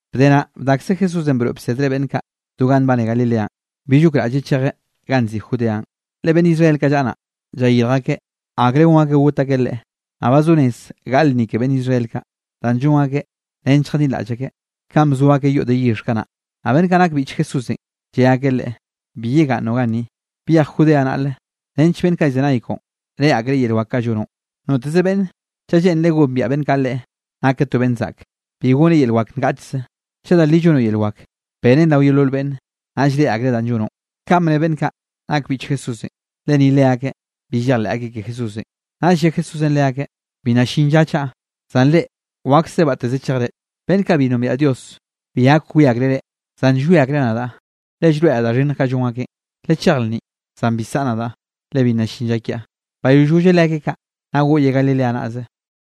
Bde naꞌ, bdakze Jesúsenꞌ broeꞌ bsedreꞌ beꞌnn kaꞌ do ganꞌ nbane Galileanꞌ. Bill gokraꞌlleꞌ chejlleꞌ ganꞌ nziꞌi Judeanꞌ, le beꞌnn Israel kaꞌ llaꞌa naꞌ, llayirj akeꞌ akre gon akeꞌ got akeꞌ Leꞌe. Naꞌ ba zo rez gaꞌle lnni ke beꞌnn Israel kaꞌ, danꞌ llon akeꞌ nench lljadinraꞌll akeꞌ kanꞌ bzo akeꞌ yoꞌ de yixh kanaꞌ. Naꞌ beꞌnn kaꞌ nak beꞌnn biꞌch Jesúsenꞌ, lle akeꞌ Leꞌe: —Bi yegaꞌnnoꞌ ganni, byej Judea naꞌle nench beꞌnn kaꞌ llzenay koꞌon, reꞌe akreꞌ yel wak kaꞌ llonoꞌn. Noteze beꞌnn chaꞌ lleꞌnreꞌ gombiaꞌ beꞌnn kaꞌ leꞌe nakeꞌ to beꞌnn zaꞌk, bi goneꞌ yel wak ngaꞌchze. Chaꞌ da li llonoꞌ yel wak, benen rao yeolol beꞌnne, naꞌll reꞌe akreꞌ danꞌ llonoꞌ. Kaꞌn bne beꞌnn kaꞌ nak beꞌnn biꞌch Jesúsenꞌ, le ni leakeꞌ bi llejleꞌ akeꞌ ke Jesúsenꞌ. Naꞌll lle Jesúsenꞌ leakeꞌ: —Bi nna llin lla chaꞌa, zan reꞌ wakse batteze chejre. Beꞌnn kaꞌ bi nombiaꞌ Dios bi gak wie akreꞌ reꞌ, zan llwie akreꞌ nadaꞌ, le llroeꞌraꞌ da xhinnj kaꞌ llon akeꞌn. Lechej lnninꞌ. Zan bi saꞌa nadaꞌ, le bi nna llin lla kiaꞌ. Bayoll golleꞌ leakeꞌ kaꞌ, naꞌ goꞌyeꞌ Galilea naꞌze.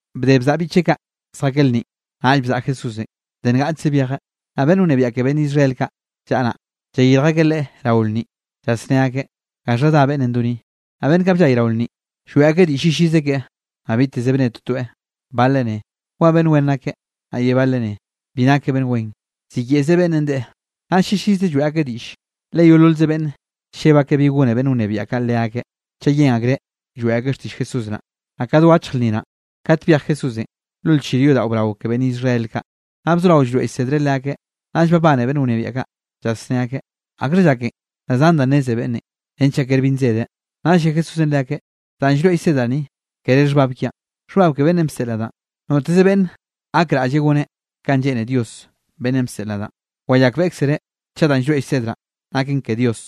Bde bzaꞌa biꞌcheꞌ kaꞌ zjakeꞌ lnninꞌ, naꞌll bzaꞌa Jesúsenꞌ, de ngaꞌchze byejeꞌ. Naꞌ beꞌnn wnebiaꞌ ke beꞌnn Israel kaꞌ llaꞌa naꞌ, llayirj akeꞌ Leꞌe rao lnninꞌ llasné akeꞌ: —¿Gaxha dá beꞌnnenꞌ do ni? Naꞌ beꞌnn kaꞌ bllay rao lnninꞌ, lloeꞌ akeꞌ diꞌll llillize keꞌe, naꞌ biteze bne totoeꞌ. Bale ne: “Wa beꞌnn wen nakeꞌ”, naꞌ ye bale ne: “Bi nakeꞌ beꞌnn wen, ziyeꞌze beꞌnnenꞌ deꞌe.” Naꞌll llillize lloeꞌ akeꞌ diꞌllenꞌ, le yeololze beꞌnne lleb akeꞌ bi gone beꞌnn wnebiaꞌ kaꞌ leakeꞌ, chaꞌ yen akreꞌ lloeꞌ akeꞌ xtiꞌll Jesús naꞌ. Naꞌ ka do achje lnni naꞌn, kate byej Jesúsenꞌ lo lchir yodaꞌo brao ke beꞌnn Israel kaꞌ, naꞌ bzoraweꞌ llroeꞌ llsedreꞌ leakeꞌ. Naꞌll babane beꞌnn wnebiaꞌ kaꞌ, llasné akeꞌ: —¿Akxha llaken da zan da nneze beꞌnnenꞌ? Renchaꞌ kere bi nzedeꞌn. Naꞌll lle Jesúsenꞌ leakeꞌ: —Danꞌ llroeꞌ llsedraꞌ ni, kere xhbab kiaꞌn, xhbab ke beꞌnnenꞌ bseꞌl nadaꞌn. Noteze beꞌnne gakraꞌlle goneꞌ kanꞌ lleꞌne Dios beꞌnnenꞌ bseꞌl nadaꞌn, wayakbeꞌkzereꞌ chaꞌ danꞌ llroeꞌ llsedraꞌn naken ke Dios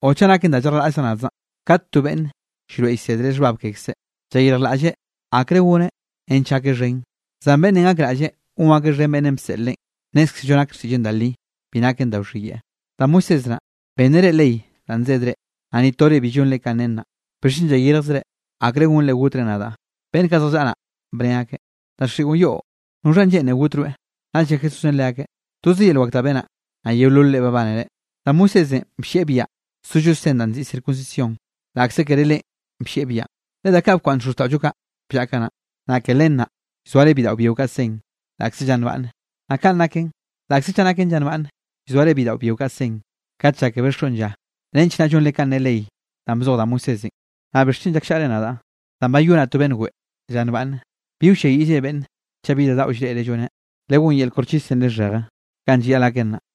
o chaꞌ naken da llarjlaꞌllaꞌ nadzaꞌ. Kate to beꞌnn llroeꞌ llsedreꞌ xhbab kekzeꞌ, llayirjlaꞌlleꞌ akre goneꞌ nench gakeꞌ xhen. Zan beꞌnn gakraꞌlle gon akeꞌ xhen beꞌnnenꞌ bseꞌl leꞌen, nnézkzello nak xtiꞌlleꞌn da li, bi naken da wxhiyeꞌe. ’Da Moisés naꞌ, benneꞌ reꞌ ley danꞌ nsedre, naꞌ ni tore bi llonre kanꞌ nen naꞌ. ¿Bixchen llayirjzre akre gonre gotre nadaꞌ? Beꞌnn kaꞌ zjallaꞌa naꞌ, bne akeꞌ: —Daxiꞌon yoꞌ. ¿Noxhanꞌ lleꞌne got rweꞌ? Naꞌll lle Jesúsenꞌ leakeꞌ: —Toze yel wak da benaꞌ, naꞌ yeololre babánere. Da Moisésenꞌ bllieꞌ biaꞌa sollo sen danꞌ nziꞌi circuncisión (laꞌkze kere leꞌen bllieꞌ biaꞌan, le da bkwaꞌnn xozxtaꞌollo kaꞌ bllaꞌa kanaꞌn), naꞌ ke len naꞌ, llzoare bidaꞌo byio kaꞌ sen, laꞌkze lla nbaꞌnne. Naꞌ kanꞌ naken, laꞌkze chaꞌ naken lla nbaꞌnne, llzoare bidaꞌo byio kaꞌ sen, kat llákebeꞌ xoꞌn lla nench naꞌ llonre kanꞌ ne ley danꞌ bzoj da Moisésenꞌ, naꞌ ¿bixchen llakllaꞌre nadaꞌ danꞌ bayonaꞌ to beꞌnn weꞌe lla nbaꞌnne? Bi wlliayiꞌllre beꞌnne chaꞌ bi da daꞌo llreꞌreꞌ lloneꞌ, legón yel koxchisenꞌ lixheje kanꞌ llayaꞌl gaken naꞌ.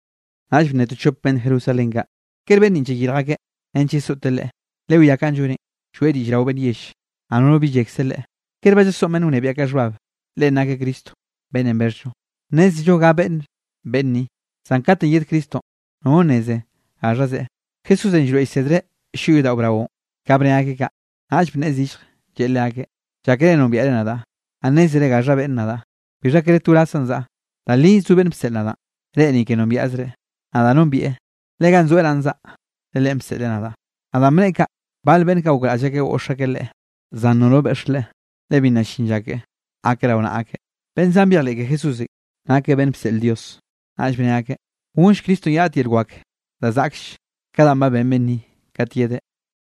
Naꞌll bne to chop beꞌnn Jerusalén kaꞌ: —¿Kere beꞌnn ninꞌ llayirj akeꞌ nench yesoꞌte Leꞌe? Lewiá kanꞌ lloneꞌn, lloeꞌ diꞌll rao beꞌnn yell, naꞌ nono bi llekze Leꞌe. ¿Kere ba llasoꞌn beꞌnn wnebiaꞌ kaꞌ xhbab, Leꞌen nakeꞌ Cristonꞌ beꞌnnenꞌ bexhllo? Nnézello ga beꞌnn beꞌnn ni, zan kat yed Cristonꞌ, nono nneze gaxha zeꞌe. Jesúsenꞌ llroeꞌ llsedreꞌ llyoꞌ yodaꞌo braonꞌ, ka bne akeꞌ kaꞌ. Naꞌll bneꞌe zillje, lleꞌe leakeꞌ: —Llákere nombiaꞌre nadaꞌ, naꞌ nnézere gaxha beꞌnne nadaꞌ. Bixha kere to wrazzaꞌn zaꞌa. Da li zo beꞌnn bseꞌl nadaꞌn, reꞌ ni ke nombiaꞌzreꞌ. Nadaꞌ nombieꞌ, le ganꞌ zoeꞌ naꞌn zaꞌa, le Leꞌen bseꞌleꞌ nadaꞌ. Naꞌ danꞌ bneꞌe kaꞌ, bale beꞌnn kaꞌ gokraꞌll akeꞌ goꞌx akeꞌ Leꞌe, zan nono beꞌx Leꞌe, le bi nna llin lla keꞌe, gakeꞌ rao naꞌa akeꞌ. Beꞌnn zan byejleꞌ ke Jesúsenꞌ, nakeꞌ beꞌnn bseꞌl Dios, naꞌll bne akeꞌ: —¿Gonlle Cristonꞌ ye raꞌt yel wak da zaꞌklle ka danꞌ ba ben beꞌnn ni, kat yedeꞌ?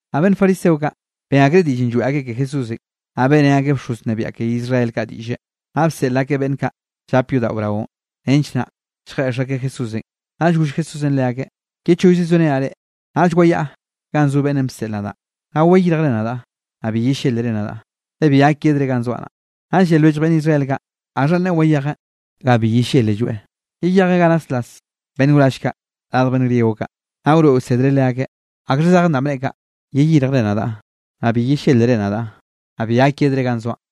Naꞌ beꞌnn fariseo kaꞌ, ben akreꞌ diꞌllenꞌ lloeꞌ akeꞌ ke Jesúsenꞌ. Naꞌ beꞌrén akeꞌ bxoz wnebiaꞌ ke Israel kaꞌ diꞌlle, naꞌ bseꞌl akeꞌ beꞌnn kaꞌ llap yodaꞌo braonꞌ, nench naꞌ lljeꞌx akeꞌ Jesúsenꞌ. Naꞌll goll Jesúsenꞌ leakeꞌ: —Ye chollze sorenaꞌ reꞌ, naꞌll wayaꞌa ganꞌ zo beꞌnnenꞌ bseꞌl nadaꞌ naꞌ. Naꞌll wayirjre nadaꞌ, naꞌ bi yellélere nadaꞌ, le bi gak yedre ganꞌ zoaꞌ naꞌ. Naꞌll lle lwellj beꞌnn Israel kaꞌ: —¿Gaxhanꞌ neꞌe wayejeꞌ ga bi yellélelloeꞌ? ¿Yeyejeꞌ ganꞌ naslas beꞌnn wrall kaꞌ radj beꞌnn griego kaꞌ, naꞌ wroeꞌ wsedreꞌ leakeꞌn? ¿Akxha zejen danꞌ bneꞌe kaꞌ: “Yeyirjre nadaꞌ, naꞌ bi yellélere nadaꞌ, naꞌ bi gak yedre ganꞌ zoaꞌn”?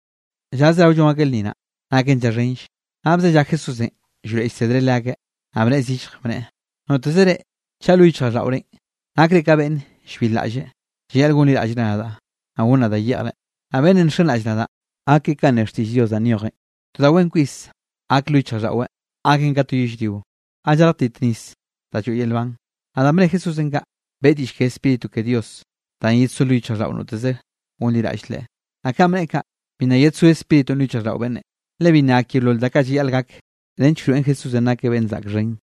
Lla zerao llon akeꞌ lnni naꞌ, naken lla xhenlle, naꞌ bzellá Jesúsenꞌ llroeꞌ llsedreꞌ leakeꞌ, naꞌ bneꞌe zillje, bneꞌe: —Noteze reꞌ, chaꞌ lo yichjraꞌlldaꞌorenꞌ nakre ka beꞌnne llbilraꞌlle, llayaꞌl gonliraꞌllre nadaꞌ, naꞌ gonnaꞌ da yeꞌjre. Naꞌ beꞌnnenꞌ nxenraꞌll nadaꞌ, gak keꞌe kanꞌ ne xtiꞌll Dios danꞌ nyojen, to da wen kwis gak lo yichjraꞌlldaꞌweꞌ, gaken ka to yellrio ga llartit nis da lloeꞌ yel nban. Naꞌ danꞌ bne Jesúsenꞌ kaꞌ, beꞌe diꞌll ke Spíritu ke Dios danꞌ yedsó lo yichjraꞌlldaꞌo noteze gonliraꞌll Leꞌen. Naꞌ kanꞌ bneꞌe kaꞌ, bi nna yedsó Spíritunꞌ lo yichjraꞌlldaꞌo beꞌnne, le bi nna gak yeolol da kaꞌ llayaꞌl gak, nench wroeꞌn Jesúsenꞌ nakeꞌ beꞌn zaꞌk xhen.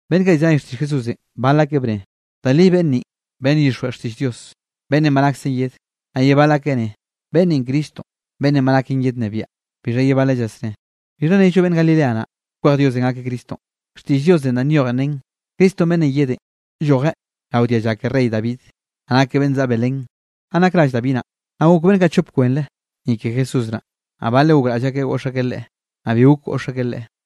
Beꞌnn kaꞌ llzenay xtiꞌll Jesúsenꞌ bal akeꞌ bne: —Da li beꞌnn ninꞌ beꞌnn llyixjweꞌ xtiꞌll Dios, beꞌnnenꞌ ba naksen yedeꞌ. Naꞌ ye bal akeꞌ ne: —Beꞌnn ninꞌ Cristonꞌ beꞌnnenꞌ ba naken yednnebiaꞌ. Bixha ye baleꞌn llasneꞌe: —¿Bixha nello beꞌnn Galilea naꞌ, kwej Diosenꞌ gakeꞌ Cristonꞌ? Xtiꞌll Diosenꞌ danꞌ nyojen nen, Cristo beꞌnnenꞌ yedenꞌ, llojeꞌ rao dialla ke rey David, naꞌ nakeꞌ beꞌnn zaꞌa Belén ganꞌ nak rall David naꞌ. Naꞌ gok beꞌnn kaꞌ chop kweꞌre, ni ke Jesús naꞌ. Naꞌ baleꞌ gokraꞌll akeꞌ goꞌx akeꞌ Leꞌe, naꞌ bi gok goꞌx akeꞌ Leꞌe.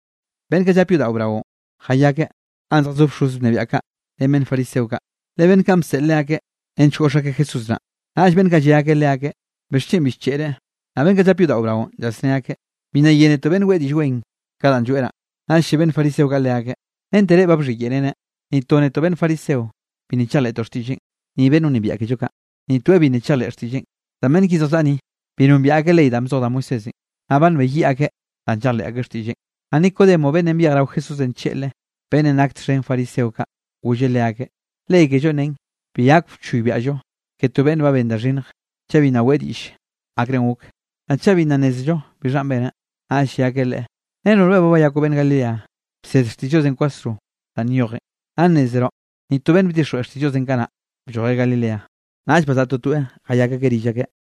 Beꞌnn kaꞌ llape yodaꞌo braonꞌ, jayakeꞌ ganꞌ zjazó bxoz wnebiaꞌ kaꞌ, ren beꞌnn fariseo kaꞌ, le beꞌnn kaꞌn bseꞌl leakeꞌ nench goꞌx akeꞌ Jesús naꞌ, naꞌll beꞌnn kaꞌ lle akeꞌ leakeꞌ: —¿Bixchen bi bcheꞌreꞌ? Naꞌ beꞌnn kaꞌ llap yodaꞌon braonꞌ, llasné akeꞌ: —Bi nna yénetoꞌ beꞌnn weꞌe diꞌll wen, ka danꞌ lloeꞌ naꞌ. Naꞌll lle beꞌnn fariseo kaꞌ leakeꞌ: —¿Rente reꞌ ba bxhiyeꞌreneꞌ? Ni to netoꞌ beꞌnn fariseo, bi nna chejleꞌtoꞌ xtiꞌlleꞌn, ni beꞌnn wnebiaꞌ kello kaꞌ, ni toeꞌ bi nna chejleꞌ xtiꞌlleꞌn. Zan beꞌnn ki zjallaꞌa ni, bi nombiaꞌ akeꞌ ley danꞌ bzoj da Moisésenꞌ, naꞌ ba nbeyiꞌ akeꞌ, danꞌ llejleꞌ akeꞌ xtiꞌlleꞌn. Naꞌ Nicodemo beꞌnnenꞌ byej rao Jesúsenꞌ tlleꞌlre beꞌnnenꞌ nak txhen fariseo kaꞌ, golleꞌ leakeꞌ: —Ley kellonꞌ nen bi gak wchoybiaꞌllo ke to beꞌnne ba ben da xhinnj, chaꞌ bi nna weꞌe diꞌll akrenꞌ gok, naꞌ chaꞌ bi nna nnézello bixhanꞌ beneꞌ. Naꞌll lle akeꞌ leꞌe: —¿Renoꞌ rweꞌ ba bayakoꞌ beꞌnn Galilea? Bsed xtiꞌll Diosenꞌ kwasro danꞌ nyojen, naꞌ nnezroꞌ ni to beꞌnn bdixjweꞌ xtiꞌll Diosenꞌ kanaꞌ bllojeꞌ Galilea. Naꞌll bazaꞌa totoeꞌ, jayak akeꞌ rill akeꞌ.